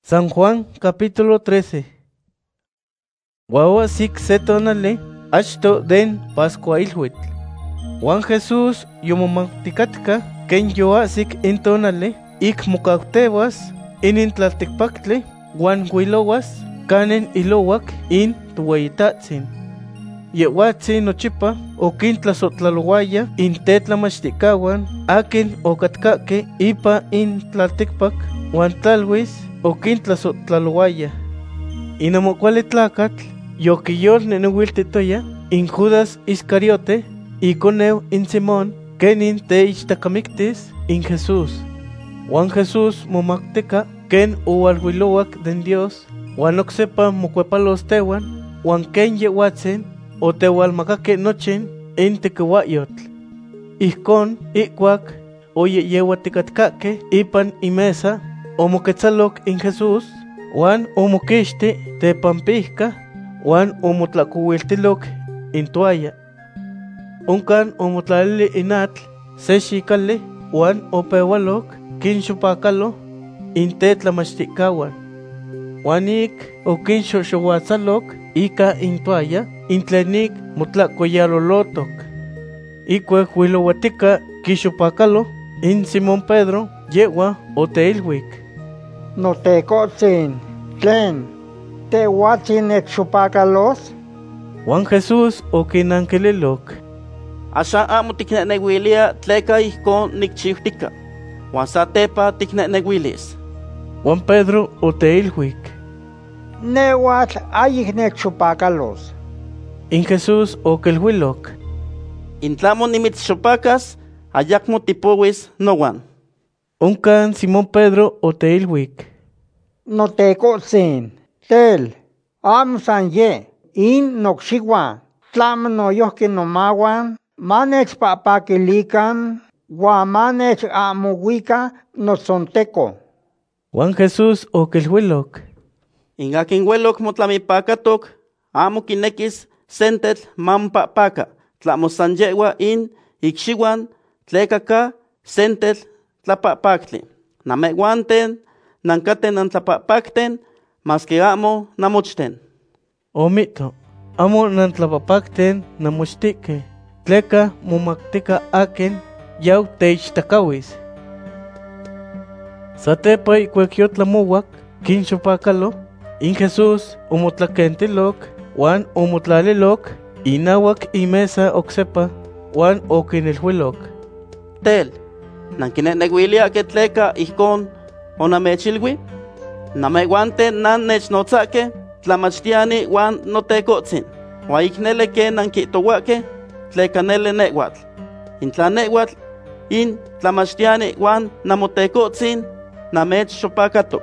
Huan oahsic se tonali achto den pascuahiluitl. Huan Jesús yomomauticatca quen yoahsic in tonali ic mocautehuas inin tlalticpactli huan huilohuas canin ilohuac in Tohueyitahtzin. Yehhuatzin nochipa oquintlasohtlalohuaya in tetlamachticahuan aquin ocatcahque ipan in tlalticpac, huan tlaluis oquintlasohtlalohuaya. In ahmo cuali tlacatl yoquiyolnehnehuiltihtoya in Judas Iscariote, iconeu in Simón, quenin teichtacatemactis in Jesús. Huan Jesús momautica quen ohualuilohuac den Dios, huan oc sepa mocuepalos tehuan, huan quen Yehhuatzin otehualmacaque nochin in tequihuahyotl. Ijcon, ihcuac oyehyehuaticatcahque ipan in mesa, omoquetzaloc in Jesús huan omoquixti tepampijca, huan omotlahcohuiltiloc in toalla. Oncan omotlalili in atl se xicali huan opehualoc quinxopacalo in tetlamachticahuan. Huan ic oquinxohxohuatzaloc ica in toalla in tlen ic motlahcoyalolotoc. Ihcuac huilohuatica quixopacalo in Simón Pedro, yehhua oteiluic: ―Notecohtzin, tlen, ¿Tehhuatzin nechxopacalos? Huan Jesús oquinanquililoc: ―Axan ahmo ticnehnehuiliya tleca ijcon nicchiutica, huan satepa ticnehnehuilis. Huan Pedro oteiluic: ―Nehhuatl ahyic nechxopacalos. In Jesús oquiluiloc: ―In tlahmo nimitzxopacas, ayacmo tipohuis nohuan. Oncan Simón Pedro oteiluic: ―Notecohtzin, tel, ahmo san yeh in nocxihuan, tlahmo noyojqui nomahuan manechpahpaquilican huan manechahmohuican notzonteco. Huan Jesús oquiluiloc: ―In aquin hueloc motlamipacatoc ahmo quinequis sentetl mamopahpaca, tlahmo san yehhua in icxihuan, tleca ca sentetl tlapahpactli. Namehhuanten nancaten nantlapahpacten, masque ahmo namochten. Omihto: “Ahmo nantlapahpacten namochtehque”, tleca momautica aquin yau teichtacahuis. Satepa ihcuac yotlamohuac quinxopacalo, in Jesús omotlaquentiloc, huan omotlaliloc inahuac in mesa oc sepa. Huan oquiniluiloc: ―Tel, ¿nanquinehnehuiliyahque tleca ijcon onamechchihuili? Namehhuanten nannechnotzahque Tlamachtiyani huan Notecohtzin, huan ic nele quen nanquihtohuahque, tleca nele nehhuatl. In tla nehhuatl, in Tlamachtiyani huan Namotecohtzin namechxopacatoc,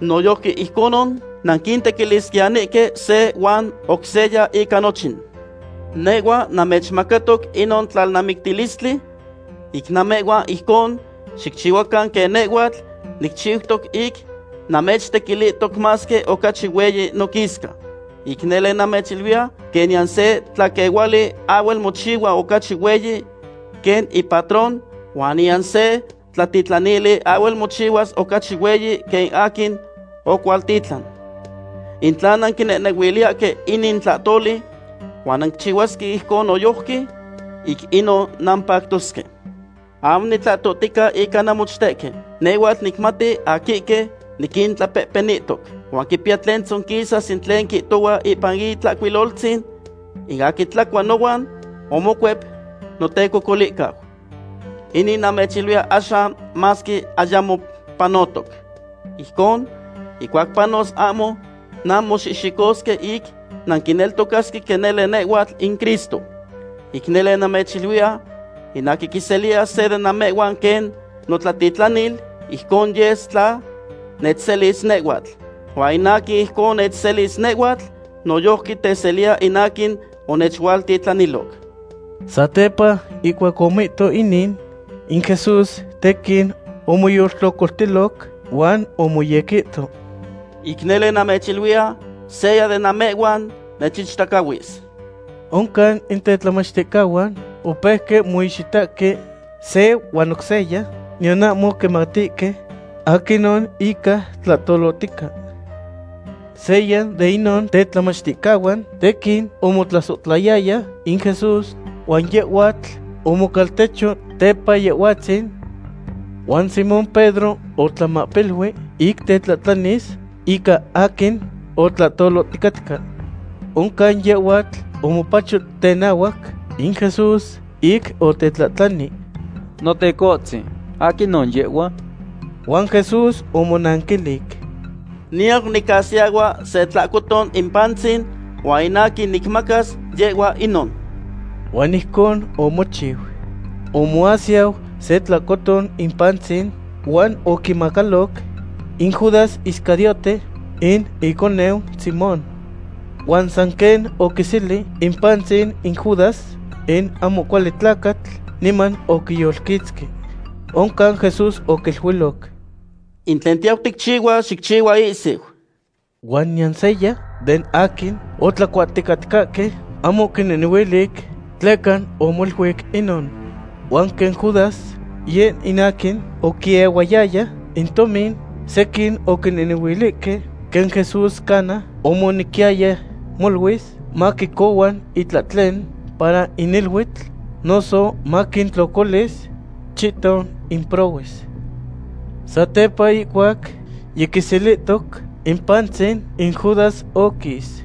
noyojqui ijconon nanquitequilisquiyanihque se huan oc seya ica nochin. Nehhuatl namechmacatoc inon tlalnamictilistli, ic namehhuan ijconon xicchihuacan quen nehhuatl nicchiutoc ic namechtequilihtoc masque ocachi hueyi noquisca. Ic nele namechiluiya, quen niyan se tlaquehuali ahhuel mochihua ocachi hueyi quen ipatron huan niyan se tlatitlanili ahhuel mochihuas ocachi hueyi quen in aquin oquihualtitlan. In tla nanquinehnehuiliyahque inin tlahtoli huan nanquichihuasque ijcon noyojqui, ic inon nampactosque. ’Ahmo nitlahtohtica ica namochtehque; nehhuatl nicmati aquihque niquintlapehpenihtoc. Huan quipiya tlen tzonquisas in tlen quihtohua ipan Itlahcuiloltzin: “In aquin tlacua nohuan, omocuep notecocolihcau.” Inin namechiluiya axan masque ayamo panotoc. Ijcon, ihcuac panos ahmo nanmoxihxicosque ic nanquineltocasque quen nele nehhuatl in Cristo. Ic nele namechiluiya, in aquin quiseliya se de namehhuan quen notlatitlanil, ijcon yes tla nechselis nehhuatl; huan in aquin ijcon nechselis nehhuatl, noyojqui teseliya in aquin onechualtitlaniloc. Satepa ihcuac omihto inin, in Jesús tequin omoyoltlocoltiloc, huan omoyequihto: ―Ic nele namechiluiya, seya den namehhuan nechichtacahuis. Oncan in tetlamachticahuan opeuque moixitahque se huan oc seya, niyan ahmo quimatihque aquinon ica tlahtolotica. Seya den inon tetlamachticahuan, tequin omotlasohtlayaya in Jesús, huan yehhuatl omocaltecho tepa Yehhuatzin. Huan Simón Pedro otlamahpilui ic tetlahtlanis ica aquin otlahtoloticatca. Oncan yehhuatl omopacho tenahuac in Jesús ic otetlahtlani: ―Notecohtzin, ¿aquinon yehhua? Huan Jesús omonanquilic: ―Niyau nicasiyahua se tlacoton in pantzin, huan in aquin nicmacas, yehhua inon. Huan ijcon omochiu. Omoasiyau se tlacoton in pantzin huan oquimacaloc in Judas Iscariote, in iconeu Simón. Huan san quen oquiseli in pantzin in Judas, in ahmo cuali tlacatl niman oquiyolquitzqui. Oncan Jesús oquiluiloc: ―In tlen tiyau ticchihua, xicchihua ihsiu. Huan niyan seya den aquin otlacuahticatcahque ahmo oquinehnehuilic tleca omoluic inon. Huan quen Judas yeh in aquin oquiehuayaya in tomin, sequin oquinehnehuilihque quen Jesús cana omonequiyaya moluis maquicohua itlahtlen para in iluitl, noso maquintlocolis chihton in prohues. Satepa ihcuac yiquiselihtoc in pantzin, in Judas oquis.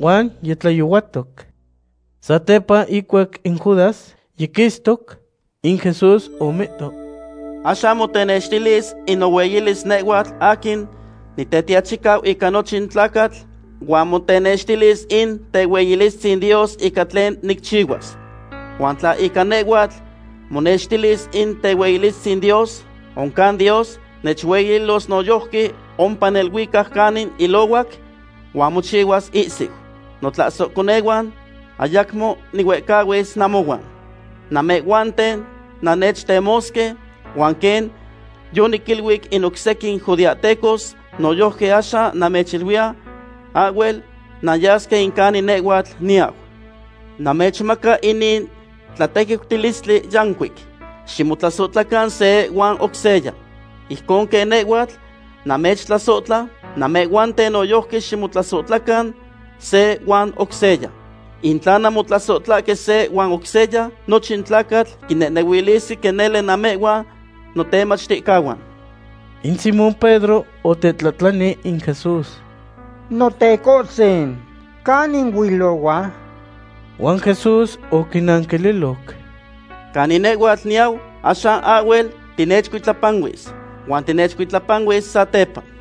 Huan yitlayohuatoc. Satepa ihcuac in Judas yiquistoc, in Jesús omihto: ―Axan motenextilis in nohueyilis nehhuatl aquin Nitetiachicau ica nochin tlacatl, huan motenextilis in tehueyilistzin Dios ica tlen nicchihuas. Huan tla ica nehhuatl monextilis in tehueyilistzin Dios, oncan Dios nechueyililos noyojqui ompa neluicac canin ilohuac, huan mochihuas ihsiu. Notlasohconehuan, ayacmo nihuehcahuis namohuan. Namehhuanten nannechtemosque, huan quen yoniquiniluic in oc sequin judeahtecos, noyojqui axan namechiluiya: Ahhuel nanyasque in canin nehhuatl niyau. Namechmaca inin tlatequiutilistli yancuic; ximotlasohtlacan se huan oc seya. Ijcon quen nehhuatl namechtlasohtla, namehhuanten noyojqui ximotlasohtlacan se huan oc seya. In tla nanmotlasohtlahque se huan oc seya, nochin tlacatl quinehnehuilisque quen nele namehhuan notemachticahuan. In Simón Pedro otetlahtlani in Jesús: ―Notecohtzin, ¿canin huilohua? Huan Jesús oquinanquililoc: ―Canin nehhuatl niyau, axan ahhuel tinechcuitlapanuis, huan tinechcuitlapanuis satepa.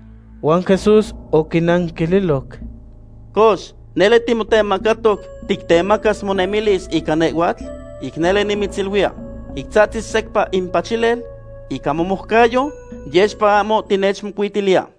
Huan Jesús oquinanquililoc: ―Cox, ¿nele timotemacatoc tictemacas monemilis ica nehhuatl? Ic nele nimitziluiya, ic tzahtzis secpa in pachilel, ica momoucayo, yexpa ahmo tinechmocuitiliya.